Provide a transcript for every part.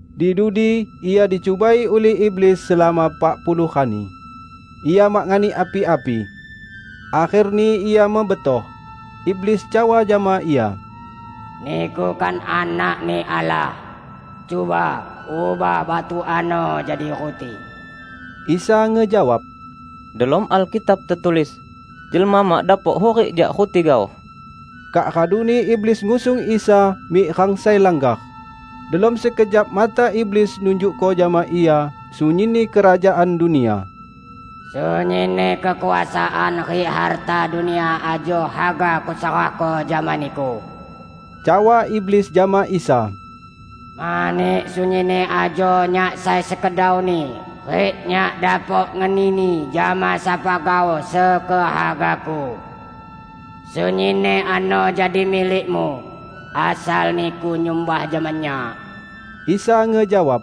Di dudi Ia dicubai ulih iblis selama pak puluh rani, Ia mak nganik api-api. Akherni Ia mebetoh. Iblis cawa jama Ia, "Niku kan Anak-Ni Allah? Cuba, ubah batu ano jadi ruti." Isa ngejawab, "Delom Alkitab tetulis, 'Jelma mak dapok hurik jak ruti gaoh.' " Kak raduni iblis ngusung Isa mik rang sai langgar, delom sekejap mata iblis nunjukko jama Ia sunyinni kerajaan dunia. "Sunyinni kekuasaan rik harta dunia ajo haga kuserahko jama Niku," cawa iblis jama Isa, "mani sunyinni ajo nyak sai sekedauni rik nyak dapok ngenini jama sapa gaoh sekehagaku. Sunyinni ano jadi milik-Mu, asal Niku nyumbah jama nyak." Isa ngejawab,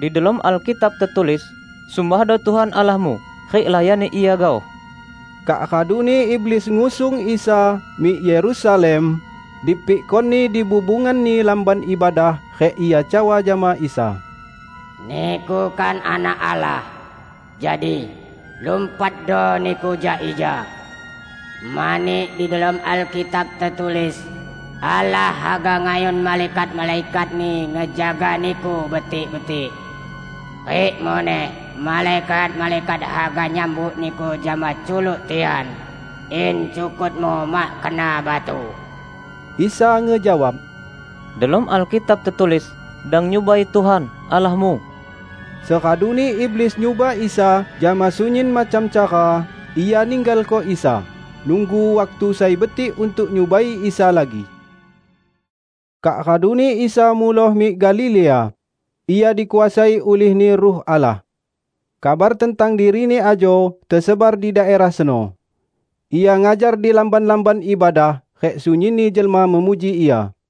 "Di delom Alkitab tetulis, 'Sumbahdo Tuhan Allahmu rik layani Ia gaoh.' " Kak raduni iblis ngusung Isa mik Yerusalem dipikkoni dibubunganni Lamban Ibadah rik ia cawa jama Isa, "Niku kan Anak Allah? Jadi, lumpatdo niku jak ija. Mani di delom Alkitab tetulis, 'Allah haga ngayun malaikat-malaikat-Ni ngejaga Niku betik-betik.' Rik muneh, 'Malaikat-malaikat haga nyambut Niku jama culuk tian, in cukut-Mu mak kena batu.' " Isa ngejawab, "Delom Alkitab tetulis, 'Dang nyubai Tuhan, Allahmu.' " Seraduni iblis nyuba Isa jama sunyin macam cara, ia ninggalko Isa, nunggu waktu sai betik untuk nyubai Isa lagi. Kak raduni Isa muloh mik Galilea; Ia dikuasai ulih-Ni Ruh Allah. Kabar tentang diri-Ni ajo tesebar di daerah seno. Ia ngajar di lamban-lamban ibadah, rik sunyinni jelma memuji Ia.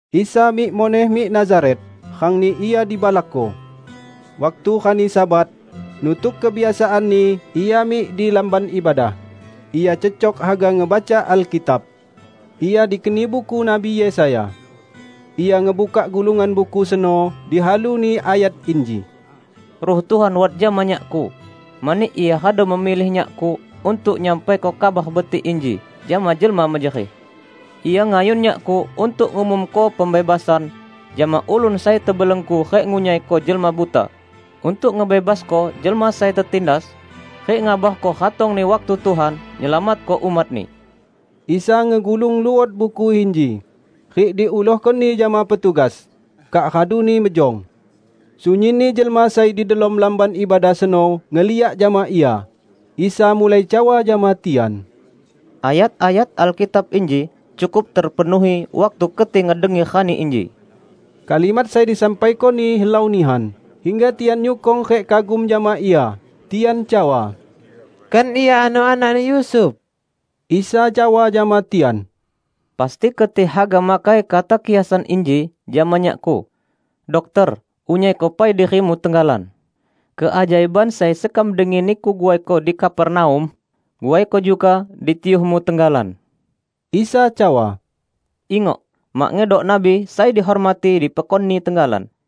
Isa mik muneh mik Nazaret, rangni Ia dibalakko. Waktu rani Sabat, nutuk kebiasaan-Ni Ia mik di lamban ibadah. Ia cecok haga ngebaca Alkitab, Ia dikeni buku Nabi Yesaya. Ia ngebukak gulungan buku seno, dihalu-Ni ayat inji, "Ruh Tuhan wat jama Nyak-Ku, mani Ia radu memilih Nyak-Ku untuk nyampaiko Kabar Betik inji jama jelma mejerih. Ia ngayun Nyak-Ku untuk ngumumko pembebasan jama ulun sai tebelenggu rik ngunyaiko jelma buta; untuk ngebebasko jelma sai tetindas. rik ngabarko ratongni waktu Tuhan, nyelamatko umat-Ni." Isa ngegulung luot buku inji, rik diulohkoni jama petugas, kak raduni mejong. Sunyinni jelma sai di delom lamban ibadah seno ngeliak jama Ia. Isa mulai cawa jama tian, "Ayat-ayat Alkitab inji cukup terpenuhi waktu keti ngedengi rani inji." Kalimat sai disampaiko-Ni helau nihan, hingga tian nyukong rik kagum jama Ia. Tian cawa, "Kan Ia ano anakni Yusuf?" Isa cawa jama tian, "Pasti keti haga makai kata kiasan inji jama Nyak-Ku, 'Dokter, unyaiko pai diri-Mu tenggalan. Keajaiban sai sekam dengi Niku guaiko di Kapernaum, guaiko juga di tiyuh-Mu tenggalan.' " Isa cawa, "Ingok, mak ngedok nabi sai dihormati di pekonni tenggalan.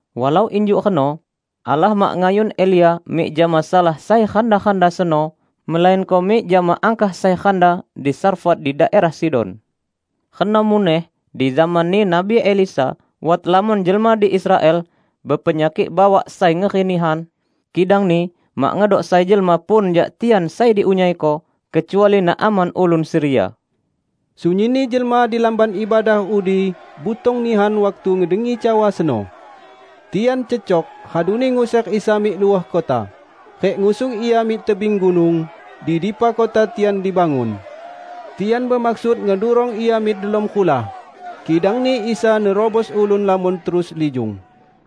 Walau injuk reno, Allah mak ngayun Elia mik jama salah sai randa-randa seno melainko mik jama angkah sai randa di Sarfat di daerah Sidon. Reno muneh di zamanni Nabi Elisa wat lamon jelma di Israel bepenyakik bawak sai ngeri nihan, kidangni mak ngedok sai jelma pun jak tian sai diunyaiko, kecuali Naaman ulun Siria." Sunyinni jelma di lamban ibadah udi butong nihan waktu ngedengi cawa seno. Tian cecok raduni nguser Isa mik luah kota, rik ngusung Ia mik tebing gunung, di dipa kota tian dibangun. Tian bemaksud ngedurong Ia mik delom rulah. Kidangni Isa nerubos ulun lamon terus lijung.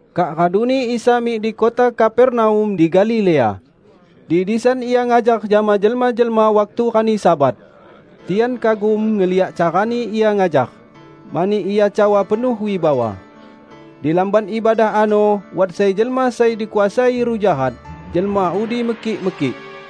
Kak raduni Isa mik di kota Kapernaum di Galilea. Di disan Ia ngajar jama jelma-jelma waktu rani Sabat. Tian kagum ngeliak carani Ia ngajar, mani Ia cawa penuh wibawa. Di lamban ibadah ano wat sai jelma sai dikuasai ruh jahat. Jelma udi mekik-mekik,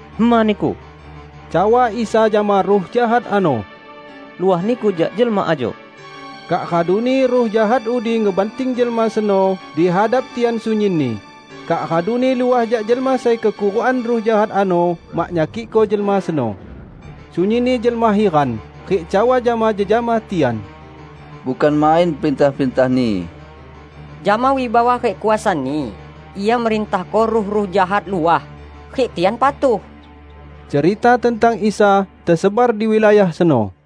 "Hema niku!" cawa Isa jama ruh jahat ano. "Luah niku jak jelma ajo!" Kak raduni ruh jahat udi ngebanting jelma seno di hadap tian sunyinni, kak raduni luah jak jelma sai kekurukan ruh jahat ano mak nyakikko jelma seno. Sunyinni jelma hiran, rik cawa jama jejama tian, "Bukan main perintah-perintah-Ni. Jama wibawa rik kuasa-Ni, Ia merintahko ruh-ruh jahat luah, rik tian patuh!" Cerita tentang Isa tesebar di wilayah seno.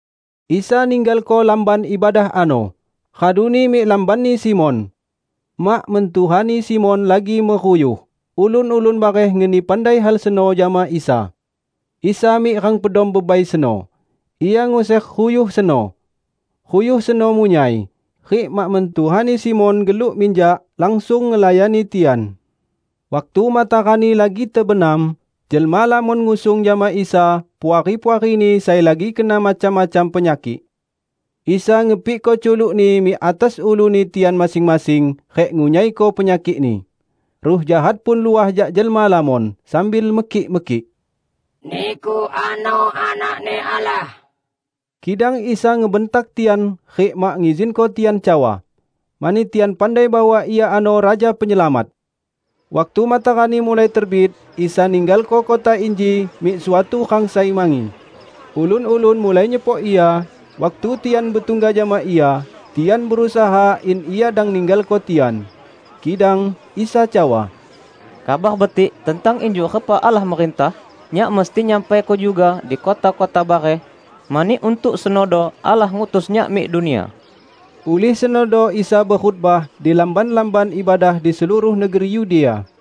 Isa ninggalko lamban ibadah ano, raduni mik lambanni Simon. Mak mentuhani Simon lagi meruyuh, ulun-ulun bareh ngeni pandai hal seno jama Isa. Isa mik rang pedom bebai seno, Ia nguser ruyuh seno. Ruyuh seno munyai, rik mak mentuhani Simon geluk minjak langsung ngelayani tian. Waktu matarani lagi tebenam, jelma lamon ngusung jama Isa puari-puarini sai lagi kena macam-macam penyakik. Isa ngepikko culuk-Ni mik atas uluni tian masing-masing rik ngunyaiko penyakikni. Ruh jahat pun luah jak jelma lamon, sambil mekik-mekik, "Niku ano Anak-Ni Allah!" Kidang Isa ngebentak tian rik mak ngizinko tian cawa, mani tian pandai bahwa Ia ano Raja Penyelamat. Waktu matarani mulai terbit Isa ninggalko kota inji mik suatu rang sai mangi. Ulun-ulun mulai nyepok Ia, waktu tian betungga jama Ia, tian berusaha in Ia dang ninggalko tian. Kidang Isa cawa, "Kabar Betik tentang injuk repa Allah merintah Nyak mesti nyampaiko juga di kota-kota bareh, mani untuk senodo Allah ngutus Nyak mik dunia." Ulih senodo Isa bekhotbah di lamban-lamban ibadah di seluruh negeri Yudea.